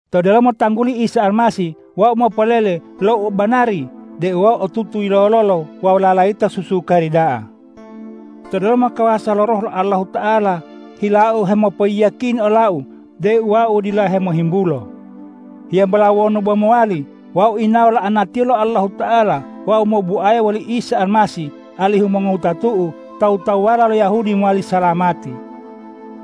To delomo tangguli Isa Almasih wau mopolele lo u banari deu wau otutu yilololo wawu lalayita susukari da'a. To delomo kawasa lo Roh lo Allahuta'ala hilau hemopoyiyakini olau deu wau dila hemohimbulo. Hiyambola wonu bo mowali, wau yinawo la'anatiyo lo Allahuta'ala wawu mobuaya woli Isa Almasih, alihu mongowutatu'u tawu-tawuwala lo Yahudi mowali salamati.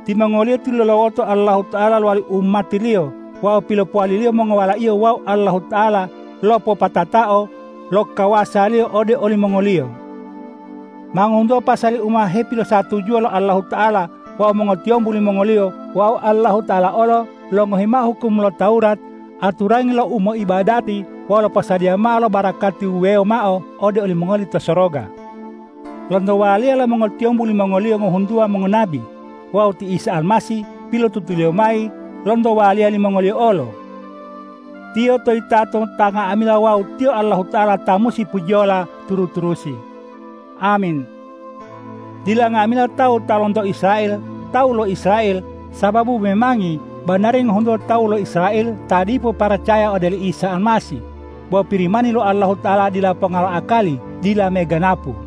Timongoliyo tilulawoto Allahuta'ala lowali umati-Liyo wawu pilopowali-Liyo mongowala-Iyo wawu Allahuta'ala lopopatatao lo kawasa-Liyo ode olimongoliyo. Ma ngohuntuwa pasali u ma hepilosatujuwa lo Allahuta'ala wawu mongotiyombu limongoliyo wawu Allahuta'ala olo longohi mao hukum lo Tawurat, aturangi lo umoibadati wawu loposadiya mao lo barakati wuwewo mao ode olimongoli to soroga. Lonto waliya lo mongotiyombu limongoliyo ngohuntuwa mongonabi. Wawu ti Isa Almasih pilotutuliyo mayi lonto waliya limongoliyo olo. Tiyo toyitato ta nga'amila wawu Tiyo Allahuta'ala ta musi pujiyola turu-turusi. Amin! Dila nga'amila tawu ta lonto Israel tawu lo Israel, sababu memangi banari ngohuntuwa tawu lo Israel ta dipo paracaya ode oli Isa Almasih. Bo Pirimani lo Allahuta'ala dila ponga lo akali dila meganapu.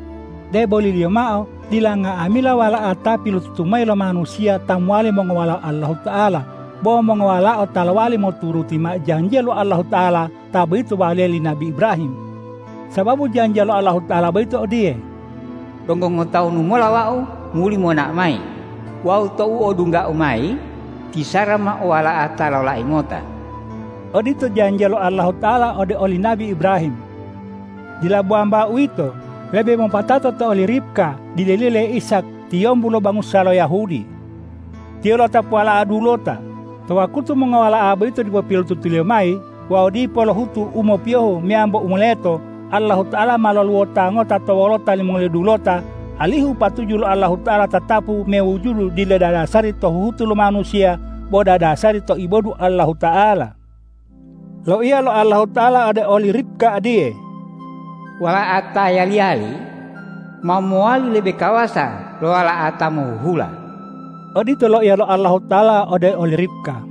Deboliliyo mao dila nga'amila wala'a ta pilotutu mayi lo manusiya ta mowali mongowalao Allahuta'ala, bo mongowalao ta lowali moturuti mao janjiya lo Allahuta'ala, ta boyito waliya li nabi Ibrahim. Sababu janjiya lo Allahuta'ala boyito odiye,”Donggo ngotawunu mola Wau muli monao mayi wawu tou odungga-U mayi, ti Sara ma o wala'a ta lolai ngota.” Odito janjiya lo Allahuta'ala ode oli nabi Ibrahim. Dila bo wambao uwito. Lebe mopatato to oli Ribka dileliyo le Ishak tiyombu lo bangusa lo Yahudi. Tiyo lo'otapu wala'a dulota. To wakutu mongowala'a boyito dipo pilotutuliyo mayi wawu dipo lohutu u mopiyohu meyambo u moleto, Allahuta'ala ma loluwota ngota to wolota limongoliyo dulota, alihu patuju lo Allahuta'ala tatapu mewujudu dila dadasari to huhutu lo manusiya bo dadasari to ibodu Allahuta'ala. Loiya lo Allahuta'ala ode oli Ribka odiye,”Wala'a ta yali-yali ma mowali lebe kawasa lo wala'a ta mohuhula.” Odito loiya lo Allahuta'ala ode oli Ribka.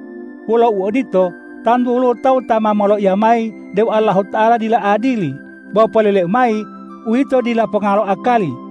Wolo uodito, tantu woluwo tawu ta ma moloiya mayi deu Allahuta'ala dila adili. Bo poleleu mayi, uwito dila ponga lo akali!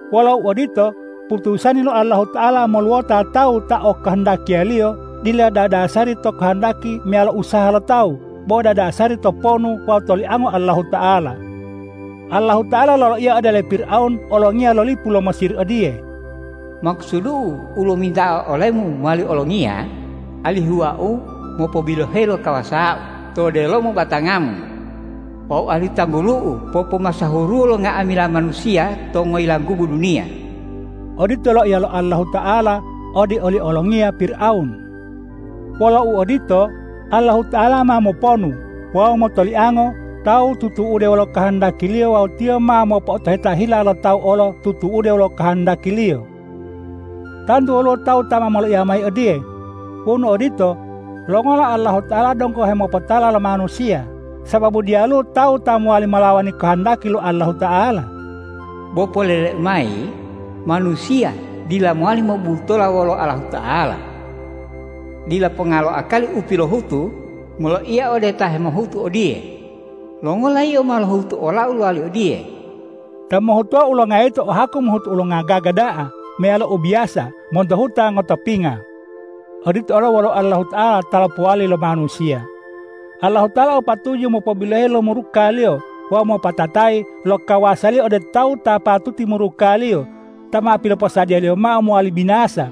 Wolo uodito, putusani lo Allahuta'ala moluwota tawu ta okohondakiya-Liyo, dila dadasari to kohondaki meyalo usaha lo tawu, bo dadasari to ponu wawu toliango Allahuta'ala. Allahuta'ala loloiya ode ole Pirawun olongiya lo lipu lo Mesir odiye,”Makusudu-U lominta'a olemu mowali olongiya, alihu Wau mopobiloheyi lo kawasa-U to delomo batangamu wawu alihu tanggulu-U popomasahuruwo lo nga'amila manusiya to ngoyilanggubu duniya.” Odito loiya lo Allahuta'ala ode oli olongiya Pirawun. Wolo uodito, Allahuta'ala ma moponu wawu motoliango tawu tutu'ude wolo kohondaki-Liyo wawu Tiyo ma mopo'otoheta hila lo tawu olo tutu'ude wolo kohondaki-Liyo. Tantu woluwo tawu ta ma moloiya mayi odiye,”Wonu odito, longola Allahuta'ala donggo hemopotala lo manusiya, sababu diyaluwo tawu ta mowali molawani kohondaki lo Allahuta'ala?” Bo poleleu mayi, manusiya dila mowali mobubutola wolo Allahuta'ala. Dila ponga lo akali u pilohutu moloiya ode ta hemohutu odiye,”Longola yio ma lohutu olau lowali odiye?” Ta mohhutuwa ulonga yito o haku mohutu ulonga gaga da'a meyalo u biyasa monto huta ngotopinga. Odito olo wolo Allahuta'ala ta lopowali lo manusiya. Allahuta'ala o patuju mopobiloheyi lo muruka-Liyo wawu mopopatatayi lo kawasa-Liyo ode tawu ta patuti muruka-Liyo, ta ma piloposadiya-Liyo mao mowali binasa.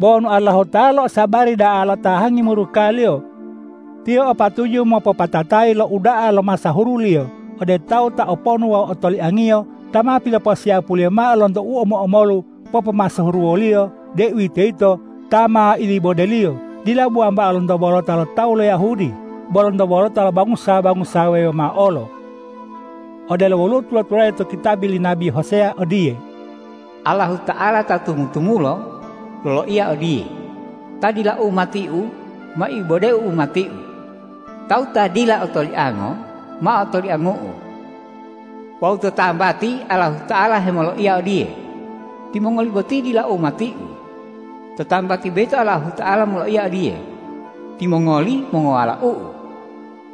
Bo wonu Allahuta'ala losabari da'a lotahangi muruka-Liyo, Tiyo o patuju mopopatatayi lo uda'a lo masahuru-Liyo ode tawu ta oponu wawu otoliang-Iyo ta ma piloposiyapu-Liyo mao lonto u omo-omolu popomasahuru wo-Liyo, deuwitoyito ito ta ma ilibode-Liyo, dila bo wambao lonto wolota lo tawu lo Yahudi, bo lonto wolota lo bangusa-bangusa wuwewo mao olo. Odelo woluwo tula-tulade to kitabi li nabi Hoseya odiye,”Allahuta'ala ta tamu-tamulo loloiya odiye, ’Ta dila umati-U ma ibode-U umati-U; tawu ta dila otoliango ma otoliangu-U.’ Wawu to tambati Allahuta'ala hemoloiya odiye, ’Timongoli boti dila umati-U,’ to tambati boyito Allahuta'ala moloiya odiye, ’Timongoli mongowalau-U.’”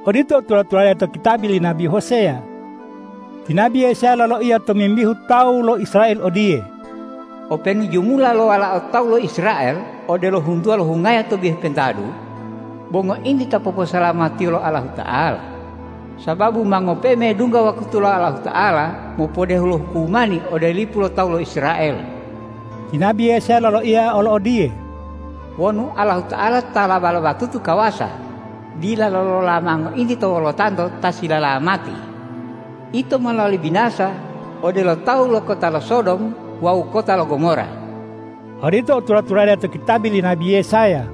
Odito u tula-tulade to kitabi li nabi Hoseya. Ti nabi Yesaya loloiya tomimbihu tawu lo Israel odiye,”Openu jumula lo walao tawu lo Israel odelo huntuwa lo hungayo to bihu pentadu, bo ngointi ta poposalamatiyo lo Allahuta'ala, sababu ma ngope'e medungga wakutu lo Allahuta'ala mopodehu lo hukumani ode lipu lo tawu lo Israel.” Ti nabi Yesaya loloiya olo odiye,”Wonu Allahuta'ala ta laba-labatutu kawasa dila lolola mao ngointi to wolotanto ta silalamati, ito ma lowali binasa odelo tawu lo kota lo Sodom wawu kota lo Gomora.” Odito u tula-tulade to kitabi li nabi Yesaya.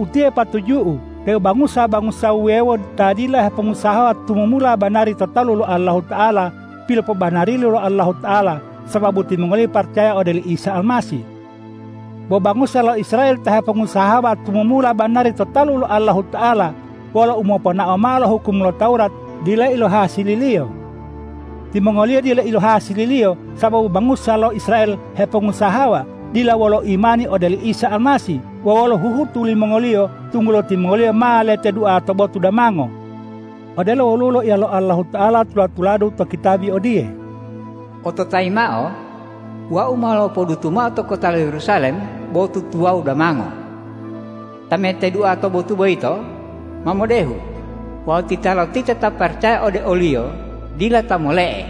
Utiye patuju'u deu bangusa-bangusa wuwewo ta dila hepongusahawa tumumula banari to talu lo Allahuta'ala, pilopobanari lo Allahuta'ala sababu timongoliyo paracaya ode oli Isa Almasih. Bo bangusa lo Israel ta hepongusahawa tumumula banari to talu lo Allahuta'ala wolo umoponao mao lo hukum lo Tawurat, dila ilohasililiyo. Timongoliyo dila ilohasiliyo sababu bangusa lo Israel hepongusahawa, dila wolo imani ode oli Isa Almasih, bo wolo huhutu limongoliyo, tunggulo timongoliyo ma letedua to botu damango. Odelo woluwo loiya lo Allahuta'ala tula-tuladu to kitabi odiye,”Ototayi mao: Wau ma lopodutu mao to kota lo Yerusalem botu tuwawu damango. Ta metedua to botu boyito ma modehu; wawu titalotita ta paracaya ode o-Liyo, dila ta mole'e.”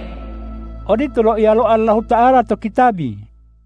Odito loiya lo Allahuta'ala to kitabi.